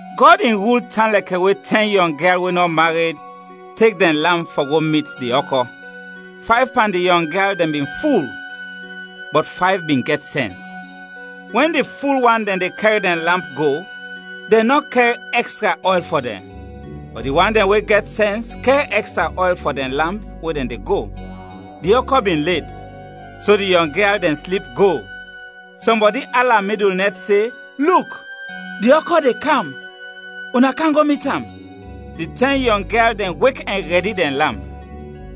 “Gɔd in rul tan lɛkɛ we tɛn yɔng gyal we nɔ mared, tek dɛn lamp fɔ go mit di ɔkɔ. Fayv pan di yɔng gyal dɛn bin ful, bɔt fayv bin gɛt sɛns. Wɛn di ful wan dɛn de kɛr dɛn lamp go, dɛn nɔ kɛr ɛkstra ɔyl fɔ dɛn; bɔt di wan dɛn we gɛt sɛns kɛr ɛkstra ɔyl fɔ dɛn lamp we dɛn de go. Di ɔkɔ bin let, so di yɔng gyal dɛn slip go. “Sɔmbɔdi ala midul nɛt se, ‘Luk, di ɔkɔ de kam! Una kam go mit am!’ Di tɛn yɔng gyal dɛn wek ɛn rɛdi dɛn lamp.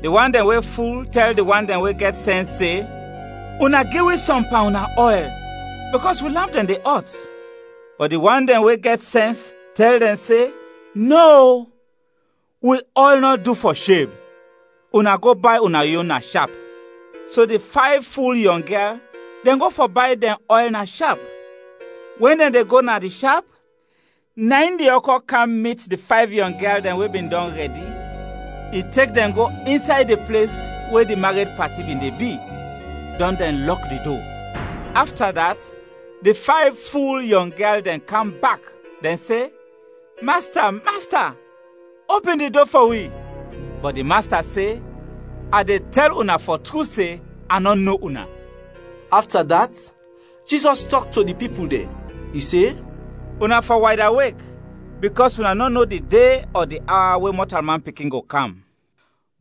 Di wan dɛn we ful tɛl di wan dɛn we gɛt sɛns se, ‘Una gi wi sɔm pan una ɔyl, bikɔs wi lamp dɛn de ɔt.’ Bɔt di wan dɛn we gɛt sɛns tɛl dɛn se, ‘Nɔ, o, wi ɔyl nɔ du fɔ sheb, una go bay una yon na shap.’ So di fayv ful yɔng gyal dɛn go fɔ bay dɛn ɔyl na shap; wɛn dɛn de go na di shap, na in di ɔkɔ kam mit di fayv yɔng gyal dɛn we bin dɔn rɛdi, i tek dɛn go insay di ples we di mared pati bin de bi, dɔn dɛn lɔk di do. “Afta dat, di fayv ful yɔng gyal dɛn kam bak, dɛn se, ‘Masta, masta opin di do fɔ wi!’ Bɔt di Masta se, ‘A de tɛl una fɔ tru se, a nɔ no una!’” Afta dat, Jizɔs tɔk to di pipul dɛn, i se, “Una fɔ waydawek, bikɔs una nɔ no di de ɔ di awa we Mɔtalman Pikin go kam.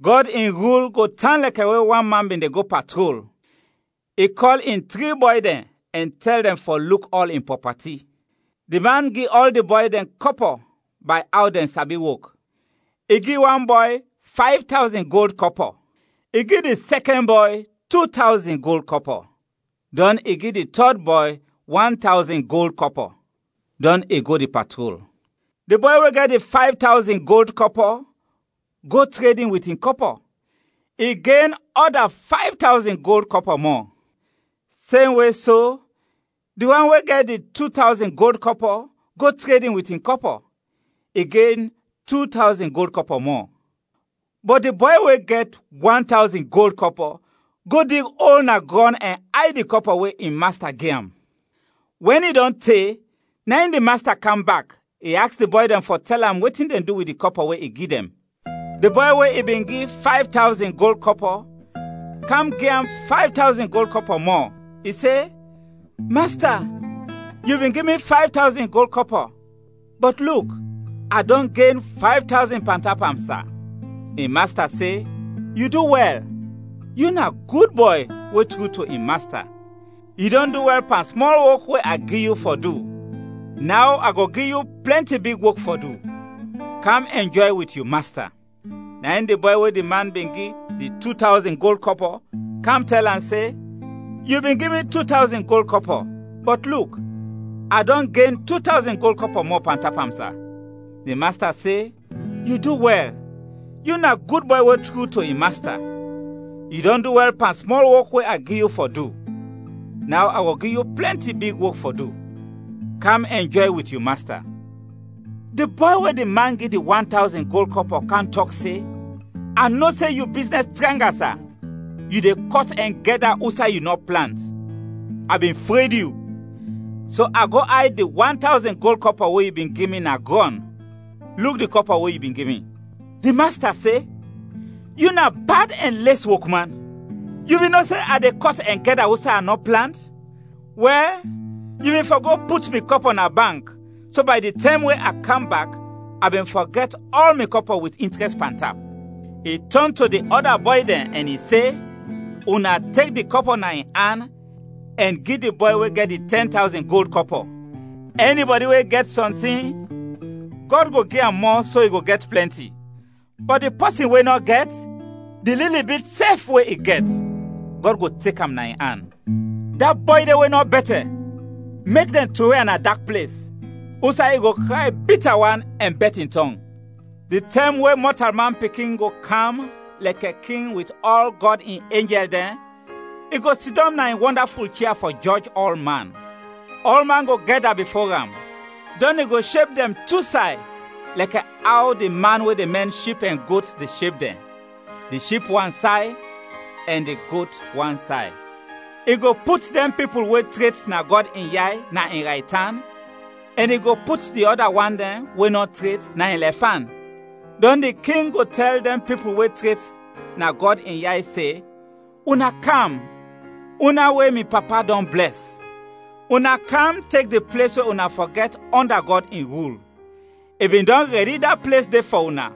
“Gɔd in rul go tan lɛkɛ we wan man bin de go patrol, i kɔl in tri bɔy dɛn ɛn tɛl dɛn fɔ luk ɔl in prɔpati. Di man gi ɔl di bɔy dɛn kɔpɔ bay aw dɛn sabi wok. I gi wan bɔy fayv tawzin gold kɔpɔ, i gi di sɛkɛn bɔy tu tawzin gold kɔpɔ, dɔn i gi di tɔd bɔy wan tawzin gold kɔpɔ. Dɔn i go di patrol. Di bɔy we gɛt di fayv tawzin gold kɔpɔ go tredin wit in kɔpɔ, i gen ɔda fayv tawzin gold kɔpɔ mɔ. Semwe so, di wan we gɛt di tu tawzin gold kɔpɔ go tredin wit in kɔpɔ, i gen tu tawzin gold kɔpɔ mɔ. Bɔt di bɔy we gɛt wan tawzin gold kɔpɔ go dig ol na grɔn ɛn ayd di kɔpɔ we in masta gi am. “Wɛn i dɔn te, na in di masta kam bak, i aks di bɔy dɛn fɔ tɛl am wetin dɛn du wit di kɔpɔ we i gi dɛn. Di bɔy we i bin gi fayv tawzin gold kɔpɔ kam gi am fayv tawzin gold kɔpɔ mɔ, i se, ‘Masta, yu bin gi mi fayv tawzin gold kɔpɔ, bɔt luk, a dɔn gen fayv tawzin pantap am, sa!’ In masta se, ‘Yu du wɛl, yu na gud bɔy we tru to in masta; yu dɔn du wɛl pan smɔl wok we a gi yu fɔ du, naw a go gi yu plɛnti big wok fɔ du. Kam ɛnjɔy wit yu masta!’ “Na in di bɔy we di man bin gi di tu tawzin gold kɔpɔ kam tɛl am se, ‘Yu bin gi mi tu tawzin gold kɔpɔ, bɔt luk, a dɔn gen tu tawzin gold kɔpɔ mɔ pantap am, sa!’ Di masta se, ‘Yu du wɛl, yu na gud bɔy we tru to in masta; yu dɔn du wɛl pan smɔl wok we a gi yu fɔ du, naw a go gi yu plɛnti big wok fɔ du. Kam ɛnjɔy wit yu masta!’ “Di bɔy we di man gi di wan tawzin gold kɔpɔ kam tɔk se, ‘A no se yu biznɛs tranga, sa, yu de kɔt ɛn gɛda usay yu nɔ plant. A bin fred yu, so a go ayd di wan tawzin gold kɔpɔ we yu bin gi mi na grɔn; luk di kɔpɔ we yu bin gi mi.’ “Di masta se, ‘Yu na bad ɛn les wok man! Yu bin no se a de kɔt ɛn gɛda usay a nɔ plant? Wɛl, yu bin fɔ go put mi kɔpɔ na bank, so bay di tɛm we a kam bak, a bin fɔ gɛt ɔl mi kɔpɔ wit intrɛst pantap.’ I tɔn to di ɔda bɔy dɛn ɛn i se, ‘Una tek di kɔpɔ na in an ɛn gi di bɔy we gɛt di tɛn tawzin gold kɔpɔ. Ɛnibɔdi we gɛt sɔntin, Gɔd go gi am mɔ, so i go gɛt plɛnti; bɔt di pɔsin we nɔ gɛt, di lili bit sɛf we i gɛt, Gɔd go tek am na in an. Da bɔy de we nɔ bɛtɛ, mek dɛn trowe am na dak ples, usay i go kray bita wan ɛn bɛt in tɔng!’ “Di tɛm we Mɔtalman Pikin go kam lɛkɛ King wit ɔl Gɔd in enjɛl dɛn, i go sidɔm na in wɔndaful chia fɔ jɔj ɔlman. Ɔlman go gɛda bifo am, dɔn i go sheb dɛn tu say lɛkɛ aw di man we de mɛn ship ɛn got de sheb dɛn, di ship wansay ɛn di got wansay. I go put dɛn pipul we tret na Gɔd in yay na in raytan, ɛn i go put di ɔda wan dɛn we nɔ tret, na in lɛfan. Dɔn di King go tɛl dɛn pipul we tret na Gɔd in yay se, ‘Una kam, una we mi Papa dɔn blɛs! Una kam, tek di ples we una fɔ gɛt ɔnda Gɔd in rul, i bin dɔn rɛdi da ples de fɔ una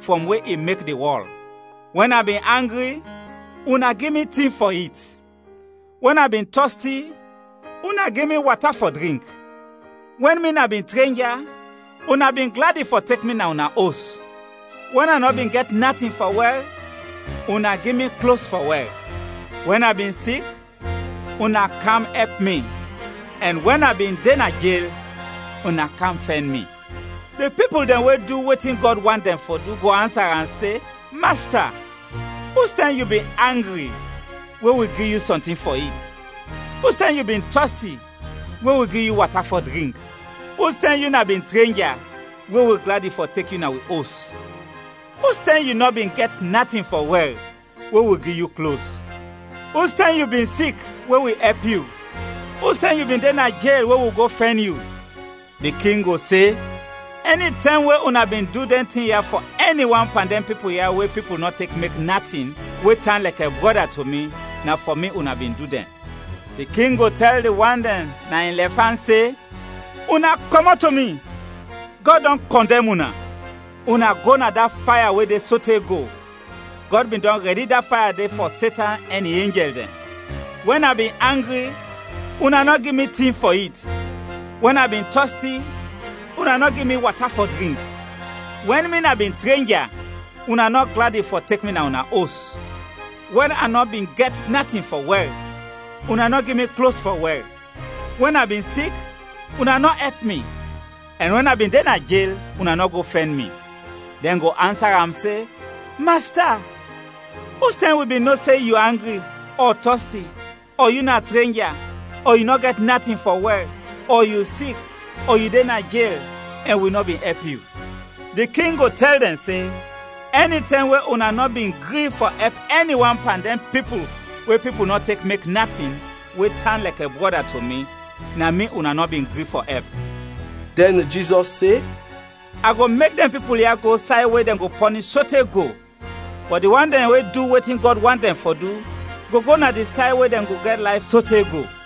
frɔm we i mek di wɔl. Wɛn a bin angri, una gi mi tin fɔ it; wɛn a bin tɔsti, una gi mi wata fɔ drink; wɛn mi na bin trenja, una bin gladi fɔ tek mi na una os; wɛn a nɔ bin gɛt natin fɔ wɛr, una gi mi klos fɔ wɛr; wɛn a bin sik, una kam ɛp mi; ɛn wɛn a bin de na jel, una kam fɛn mi.’ “Di pipul dɛn we du wetin Gɔd want dɛn fɔ du go ansa am se, ‘Masta, ustɛm yu bin angri we wi gi yu sɔntin fɔ it, ustɛm yu bin tɔsti we wi gi yu wata fɔ drink? Ustɛm yu na bin trenja we wi gladi fɔ tek yu na wi os, ustɛm yu nɔ bin gɛt natin fɔ wɛr we wi gi yu klos? Ustɛm yu bin sik we wi ɛp yu, ustɛm yu bin de na jel we wi go fɛn yu?’ Di King go se, ‘Ɛnitɛm we una bin du dɛn tin ya fɔ ɛni wan pan dɛn pipul ya we pipul nɔ tek mek natin, we tan lɛkɛ brɔda to mi, na fɔ mi una bin du dɛn.’ “Di King go tɛl di wan dɛn na in lɛfan se, ‘Una kɔmɔt to mi, Gɔd dɔn kɔndɛm una, una go na da faya we de sote go, Gɔd bin dɔn rɛdi da faya de fɔ Setan ɛn in enjɛl dɛn. Wɛn a bin angri, una nɔ gi mi tin fɔ it; wɛn a bin tɔsti, una nɔ gi mi wata fɔ drink. Wɛn mi na bin trenja, una nɔ gladi fɔ tek mi na una os; wɛn a nɔ bin gɛt natin fɔ wɛr, una nɔ gi mi klos fɔ wɛr; wɛn a bin sik, una nɔ ɛp mi; ɛn wɛn a bin de na jel, una nɔ go fɛn mi.’ “Dɛn go ansa am se, ‘Masta, ustɛm wi bin no se yu angri ɔ tɔsti ɔ yu na trenja ɔ yu nɔ gɛt natin fɔ wɛr ɔ yu sik ɔ yu de na jel, ɛn wi nɔ bin ɛp yu?’ Di King go tɛl dɛn se, ‘Ɛnitɛm we una nɔ bin gri fɔ ɛp ɛni wan pan dɛn pipul we pipul nɔ tek mek natin, we tan lɛkɛ brɔda to mi, na mi una nɔ bin gri fɔ ɛp.’” Dɛn Jizɔs se, “A go mek dɛn pipul ya go say we dɛn go pɔnish sote go, bɔt di wan dɛn we du wetin Gɔd want dɛn fɔ du go go na di say we dɛn go gɛt layf sote go.”